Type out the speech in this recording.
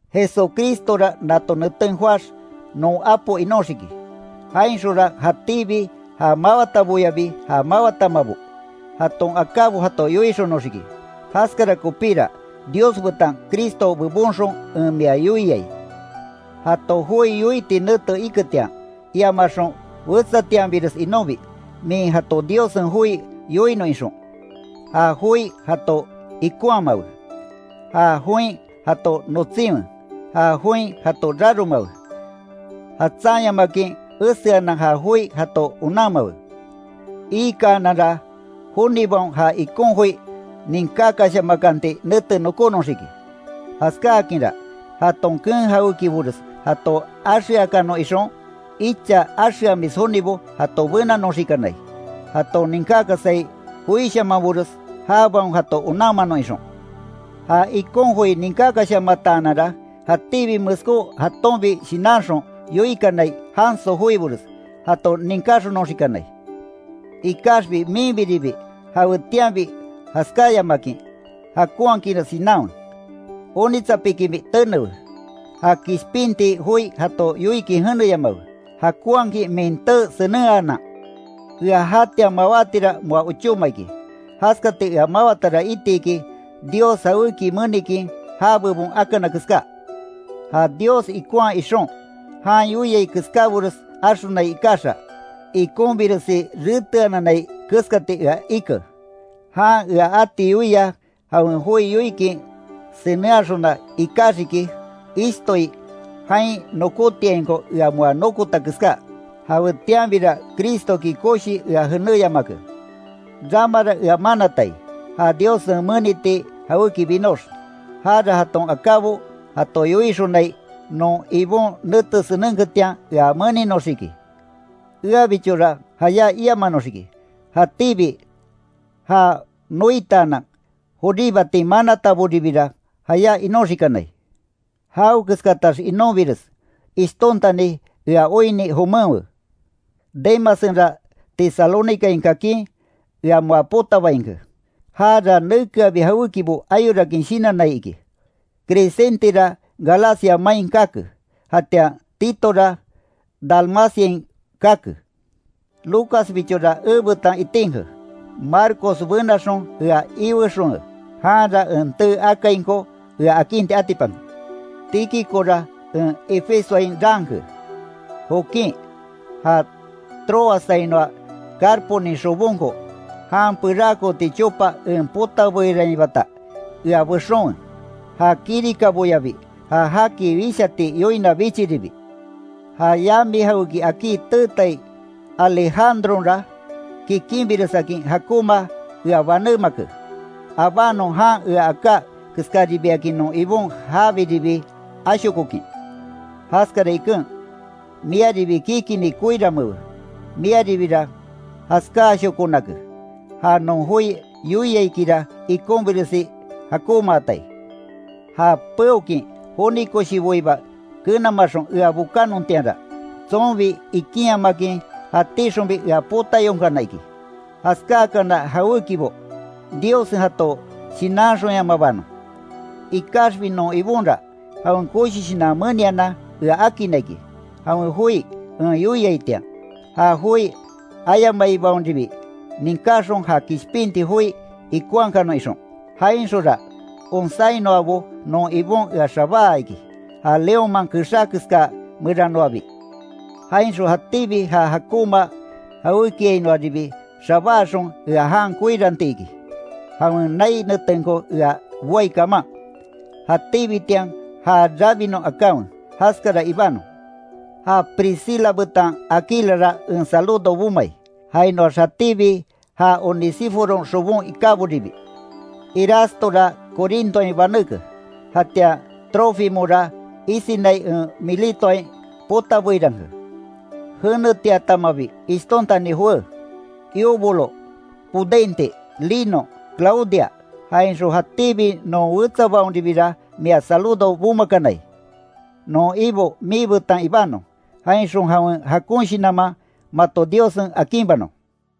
Jesucristora nato neten joáx, non Apo inóxiki, jainxonra jatíbi ja mawataboyabi ja mawatamabo, jaton akábo jato yoixonoxiki. Jaskara kopíra, Dios betan Cristo bebonxon en mia yoiai, jato joi yoiti nete iketian, iamaxon wetsatianbires inonbi, min jato Diossen joi yoinon ixon. Ja joi jato ikonhamawe, ja join jato notsinwe, ja join jato raromawe, jatsanyamakin eseanan ja joi jato onanmawe, Iikananra, jonibaon ja ikon joi ninkakashamakanti nete nokonoxiki, jaskáakinra, jaton keen jawékibores jato axeakanon ixon, icha axeamis jonibo jato benanoxikanai, jaton ninkákasai joishamanbores, jabaon jato onanmanon ixon. Ja ikon joi ninkákashamataananra, jatíbi meskó jatonbi shinanxon yoikanai janso joibores, jato ninkáxonoxikanai, Ikaxbi minbiribi jawetianbi jaskáyamakin jakonhakinres shinanwe, onitsapikinbi tenewe, ja kishpinti joi jato yoikin jeneyamawe, jakonhakin min tee senenhanan. Ea jatian mawátira moa ochóma iki, jaskati ea mawatara iti iki, Dios jawéki menikin ja bebon akana keská. Ja Dios ikonhaa ixon, jan yoiai keskábores axonai ikaxa, ikonbiresi reteananai keskati ea ike, Jan ea ati yoia jawen joi yoikin senenhaxona ikaxiki, ishtoi jain nokótiainko ea moa nokota keská, jawetianbira Cristoki koshii ea jenéyamake. Ramara ea manatai, ja Diossen meniti jawéki binox, jara jaton akábo jato yoixonai non Ibon nete senenketian, ea meninoxiki. Eabichora jayá iamanoxiki, jatíbi já noitaanan joríbatin manataboribira jayá inoxikanai. Jawekeskatax inonbires, ishtontani ea oinni jomenwe. Demassenra Tesalónicain kakin, ea moa potabainke, jara nekeabi jawékibo ayorakin shinannai iki, Crescentera Galacia main kake, jatian Titora Dalmaciain kake. Lucasbichora ebetan itinke, Marcos benaxon ea iwexonwe, janra en tee akainko ea akinti atipanke. Tíquicora en Efesoain raanke, Jokin, ja Tróassainoa Carponin xobonko, jan perakooti chopa en potabeirainbata ea bexonwe, ja kirikaboyabi ja jaki wishati yoina bichiribi, ja yami jawéki akí teetai Alejandronra, kikinbiresakin jakonma ea banémake, abanon jan ea aká keskaribiakin non Ibon jabiribi ashokokin. Jaskara iken, miaribi kikinni koiranmeewe, miaribira jaskáashokonake, ja non joi yoiaikira ikonbiresi jakonmaatai. Ja peokin joni koshiboiba kenamaxon ea bokannontianra, tsonbi ikinyamakin jatíxonbi ea potayonkana iki, jaskákana jawékibo, Diossen jato shinanxonyamabanon. Ikaxbi non Ibonra, jawen koshi shinan menianan ea akinna iki, jawen joi en yoiaitian, ja joi ayamaibaonribi ninkáxon ja kishpinti joi ikonhakanon ixon, jainxonra onsáinoabo non Ibon ea xabáa iki, ja leónman kexá keska meranoabi, jainxon jatíbi ja jakonma jawékiainoaribi xabáaxon ea jan koiranti iki, jawen nai netenko ea boai kaman, jatíbitian ja rabinon akanwe, jaskara ibanon. Ja Priscila betan Aquilara en saludo bomai, jainoax jatíbi ja Onesíforon xobon ikáboribi, Erastora Corintoain baneke, jatian Trófimora isinai en Miletoain potabeiranke. Jenetiatamabi ishtontani jowé, Eubulo, Pudente, Lino, Claudia, jainxon jatíbi non wetsabaonribira mia saludo bomakanai. Non Ibo miibetan ibanon, jainxon jawen jakon shinanman, mato Diossen akinbanon.